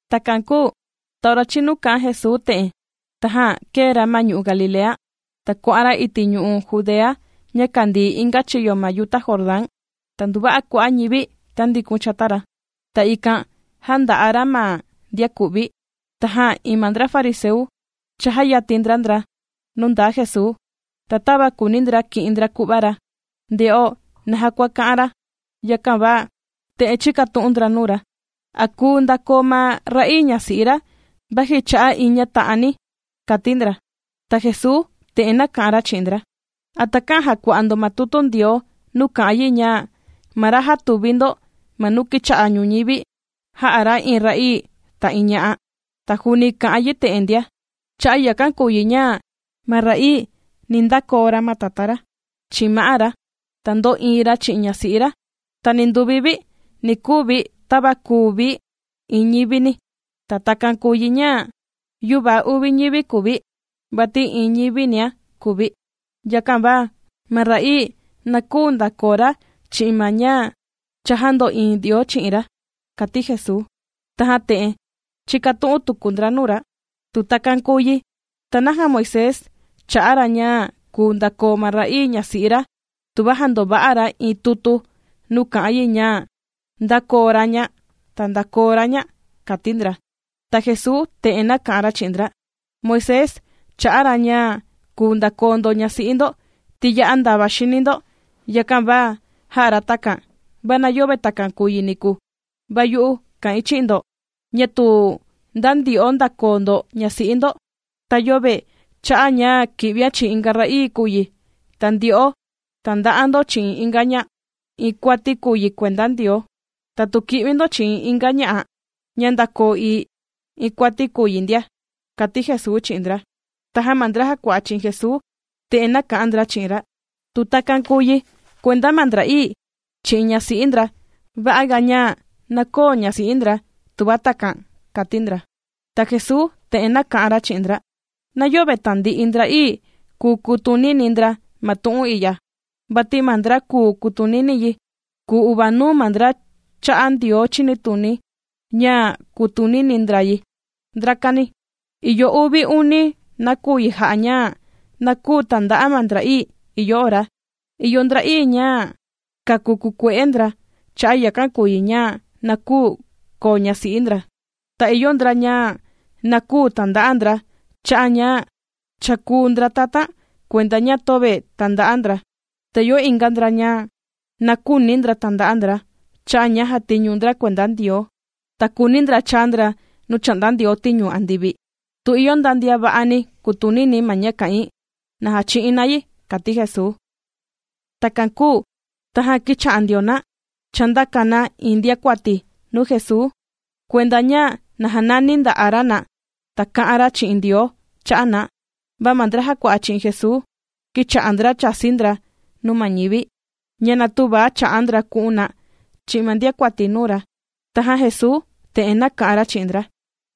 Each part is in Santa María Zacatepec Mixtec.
Takan kūu ta ora chīnu kā'an Jesuu te'en, tajan kēe ra ma ñu'u' Galilea, ta kuà'an ra iti' ñu'u' Judea ña kàndii inga chiyo ma yuta Jordán. Ta nduva'a kua'a' ñivi tāndikun chata ra, ta ikan jānda'a ra ma ndian ku'vi. Tajan iin ma ndra fariseu chājayatin ndra ndra nuu ndaa Jesuu, ta tava kùuni ndra ki'in ndra ku'va ra, ndè'o naja kua kā'an ra, yakan va te'en chīkatu'un ndra nuu ra: ―¿A kùu ndakoo ma ra'ii ñasi'i ra vaji cha'a' iin ña ta'ani? ―kàti ndra. Ta Jesuu te'en nāka'an ra chi'in ndra: ―¿A takä'an jàkua'a ndo ma tutu Ndioo nuu kà'an yi ña ma ra jātuvi ndo ma nuu kīcha'a ñuñivi, “Jā'a ra iin ra'ii, ta iin ña'a”? Ta juuni kà'an yi te'en ndia: “Cha'a' yakan kùu yi ña ma ra'ii, ni ndakoo ra ma tatá ra, chi'in ma'á ra, ta ndo'iin ra chi'in ñasi'i ra, ta ninduvi vi ni kuu vi tava kùu vi iin ñivini.” Ta takan kùu yi ña yüva uvi ñivi kùu vi, vati iin ñivinia kùu vi. Yakan va ma ra'ii, na küu ndakoo ra chi'in ma ña cha jāndo'iin Ndioo chi'in ra ―kàti Jesuu. Tajan te'en chīkatu'un tuku ndra nuu ra: ―Tu takan kùu yi, ¿ta naja Moisés chā'a ra ña kùu ndakoo ma ra'ii ñasi'i ra tuva jandova'a ra iin tutu, nuu kà'an yi ña ndàkoo ra ña, ta ndākoo ra ña? ―kàti ndra. Ta Jesuu te'en nāka'an ra chi'in ndra: ―Moisés chā'a ra ña kùu ndakoo ndo ñasi'i ndo, ti ya'a ndava xini ndo, yakan va jā'a ra takan. Va na yöve takan kùu yi niku. Va yu'u kà'in chi'in ndo, ña tu nda ndyo'o ndàkoo ndo ñasi'i ndo, ta yöve cha'a' ña kì'vian chi'in inga ra'ii kùu yi, ta ndyo'o tànda'a ndo chi'in inga ña'a, iin kuati kùu yi kuenda Ndioo. Tatu kì'vi ndo chi'in inga ña'a, ña ndākoo ii, iin kuati kùu yi ndia ―kàti Jesuu chi'in ndra. Tajan ma ndra jàkua'a chi'in Jesuu te'en nāka'an ndra chi'in ra: ―Tu takan kùu yi kuenda ma ndra'ii, chi'in ñasi'i ndra, va'a ga ña na köo ñasi'i ndra, tuva takan ―kàti ndra. Ta Jesuu te'en nāka'an ra chi'in ndra: ―Na yöve tandi'i ndra'ii kùu kutunini ndra ma tu'un i'ya, vati ma ndra kùu kutunini yi, kùu uvanuu ma ndra chā'a Ndioo chinituni ña, kutunini ndra yi, ndrakani. Ìyo uvi uni nakuyi jà'a ña na küu tanda'a ma ndra'ii: ìyo ndra'ii ña kāku kukue'e ndra, cha'a' yakan kùu yi ña na küu koo ñasi'i ndra. Ta ìyo ndra ña na küu tànda'a ndra, cha'a' ña cha kūu ndra tatan kuenda ña töve tànda'a ndra. Ta ìyo inga ndra ña na küuni ndra tànda'a ndra, cha'a' ña jàtiñu ndra kuenda Ndioo, ta kùuni ndra chaa ndra nuu chà'nda Ndioo tiñu andivi. Tu ìyo nda ndian va'ani kutunini ma ña kà'in, na jachi'in na yi ―kàti Jesuu. Takan kūu tajan kīcha'a ndio na chàndaka na iin ndiakuati nuu Jesuu kuenda ña na janani nda'a ra na, ta kā'an ra chi'in Ndioo cha'a' na. Va ma ndra jàkua'a chi'in Jesuu, kīcha'a ndra chàsi ndra nuu ma ñivi, ña na tüva cha'a ndra ku'un na chi'in ma ndiakuati nuu ra. Tajan Jesuu te'en nāka'an ra chi'in ndra: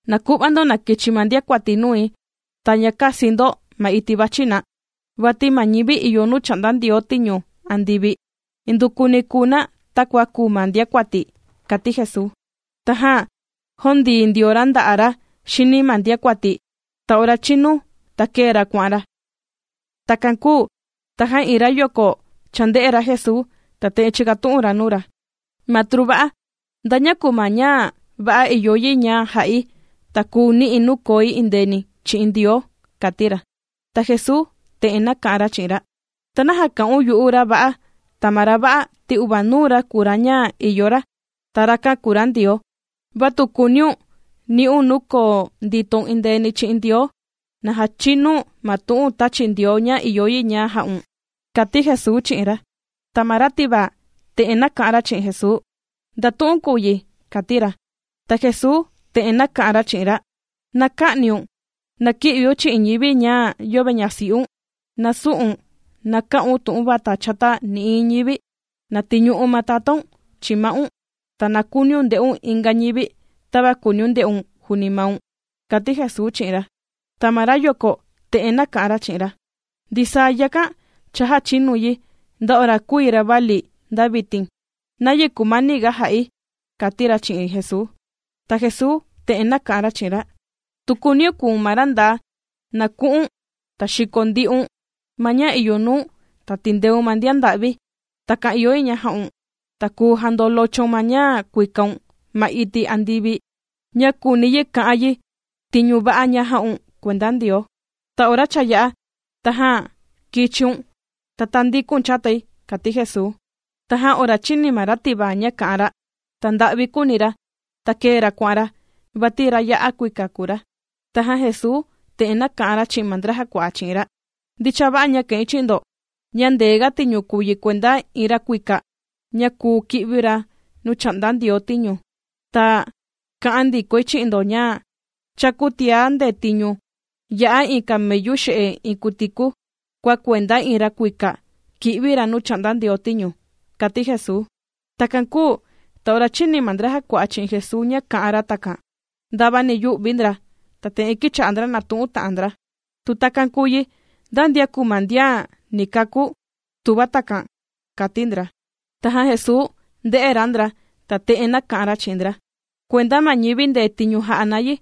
―Na ku'va ndo na kichi ma ndiakuati nui, ta ña käsi ndo ma iti' vàchi na, vati ma ñivi ìyo nuu chà'nda Ndioo tiñu andivi, indukuni kùu na takua kùu ma ndiakuati ―kàti Jesuu. Tajan jōndii ndio ra nda'a' ra xini ma ndiakuati, ta ora chīnu, ta kēe ra kuà'an ra. Takan kūu tajan iin rayoko chānde'e ra Jesuu, ta te'en chīkatu'un ra nuu ra: ―Matru va'a, ¿nda ña kùu ma ña va'a ìyo yi ña ja'i, ta kuu ni'i̱ nuu koi endeeni chi'in Ndioo? ―kàti ra. Ta Jesuu te'en nāka'an ra chi'in ra: ―¿Ta naja kà'un yu'u ra va'a? Ta ma ra va'a, ti uvanuu ra kùu ra ña ìyo ra, ta rakan kùu ra Ndioo. Va tu kùuniun ni'un nuu koo nditoun endeeni chi'in Ndioo, na jachinu̱n ma tu'un tāchi Ndioo ña ìyo yi ña ja'un, ―kàti Jesuu chi'in ra. Ta ma ra tivaa, te'en nāka'an ra chi'in Jesuu: ―¿Nda tu'un kùu yi? ―kàti ra. Ta Jesuu te'en nāka'an ra chi'in ra: ―Na kä'niun, na kï'viun chi'in ñivi ña'a yöve ñasi'un, na sü'un, na kä'un tu'un vata chata nï'iin ñivi. Na tiñu'u̱n ma tatáun chi'in ma'un, ta na kuuniun nde'un inga ñivi, tava kùuniun nde'un juuni maun ―kàti Jesuu chi'in ra. Ta ma rayoko te'en nāka'an ra chi'in ra: ―Ndisaa yakan, cha jāchinui yi, nda ora kùi ravali, ta nda vitin. ¿Nayi kumaniga jà'i? ―kàti ra chi'in Jesuu. Ta Jesuu te'en nāka'an ra chi'in ra: ―Tu kuuniun kùu̱n ma ra ndaa, na ku'un, ta xiko ndi'un ma ña ìyo nuu̱n, ta tìndeun ma ndian nda'vi. Takan ìyo yi ña ja'un, ta kùu jandolochoun ma ña kuikaun ma iti' andivi ña kùuni yi ka'an yi ña tiñu va'a jà'un kuenda Ndioo. Ta ora cha yā'a, tajan na kichiun, ta tāndikun chatai ―kàti Jesuu. Tajan ora chīni ma ra tivaa ña kā'an ra, ta nda'vi kūuni ra, ta kēe ra kuà'an ra, vati ra ya'a kuika kùu ra. Tajan Jesuu te'en nāka'an ra chi'in ma ndra jàkua'a chi'in ra: ―Ndicha va'a ña kà'in chi'in ndo, ña ndee ga tiñu kùu yi kuenda iin ra kuika ña kùu kì'vi ra nuu chà'nda Ndioo tiñu. Ta kà'an ndikoi chi'in ndo ña, chakuu tiá ndetiñu yā'a iin camellu xe'e iin kutiku, kua kuenda iin ra kuika kì'vi ra nuu chà'nda Ndioo tiñu ―kàti Jesuu. Takan kūu ta ora chīni ma ndra jàkua'a chi'in Jesuu ña kā'an ra takan, ndavani yū'vi ndra, ta te'en kīcha'a ndra nàtu'un ta'an ndra: ―Tu takan kùu yi, ¿nda ndian kùu ma ndian ni kakú?, tuva takan ―kàti ndra. Tajan Jesuu ndē'e ra ndra, ta te'en nāka'an ra chi'in ndra: ―Kuenda ma ñivi ndetiñu jà'a na yi,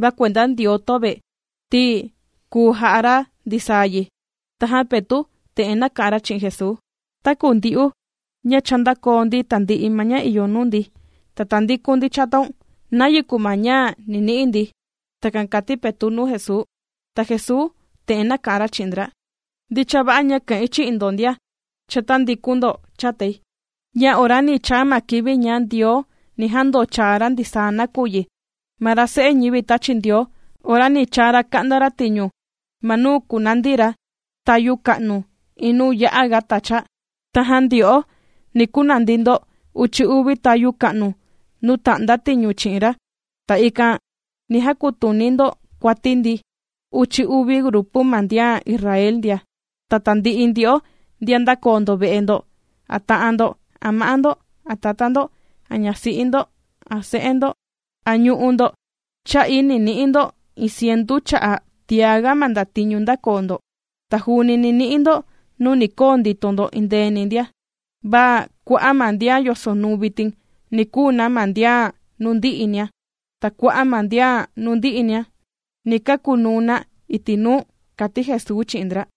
va kuenda Ndioo töve, ti kùu ja'a ra ndisaa yi. Tajan Petu' te'en nāka'an ra chi'in Jesuu: ―Taku ndyu'u ña ndākoo ndi tāndi'i ma ña ìyo nuu ndi, ta tāndikun ndi chataun. ¿Nayi kùu ma ña ni ni'i ndi? ―Takan kàti Petu' nuu Jesuu. Ta Jesuu te'en nāka'an ra chi'in ndra: ―Ndicha va'a ña kà'in chi'in ndo ndian cha tāndikun ndo chatai, ña ora ni chaa ma kivi ña Ndioo ni jandochaa ra ndisaa nakuyi, ma ra Se'e ñivi tāchi Ndioo ora ni chaa ra ka'nda ra tiñu ma nuu kunandi ra tayu ka'nu iin nuu ya'a ga tacha. Tajan ndyo'o ndia, ni kunandi ndo uchi uvi tayu ka'nu nuu ta'nda tiñu chi'in ra, ta ikan ni jakutuni ndo kuati ma ndi uchi uvi grupu ma ndian Israel ndia. Ta tandi'i ndyo'o ndian ndākoo ndo ve'e ndo, a ta'an ndo, a ma'á ndo, a tatá ndo, a ñasi'i ndo, a se'e ndo, a ñu'u' ndo, ta ndisaa yakan cha'i jā'a ndo yi. Yakan va ni ni'i ndo iin cientu cha'a tiá ga ma ndatiñu ndākoo ndo. Ta juuni ni ni'i ndo nuu ni koo ndito ndo endeeni ndia. Va kua'a' ma ndian yosonuu vitin, ni kuu na ma ndian nuu ndi'inia. Ta kua'a' ma ndian nuu ndi'inia, ni kakunuu na iti' nuu ―kàti Jesuu chi'in ndra.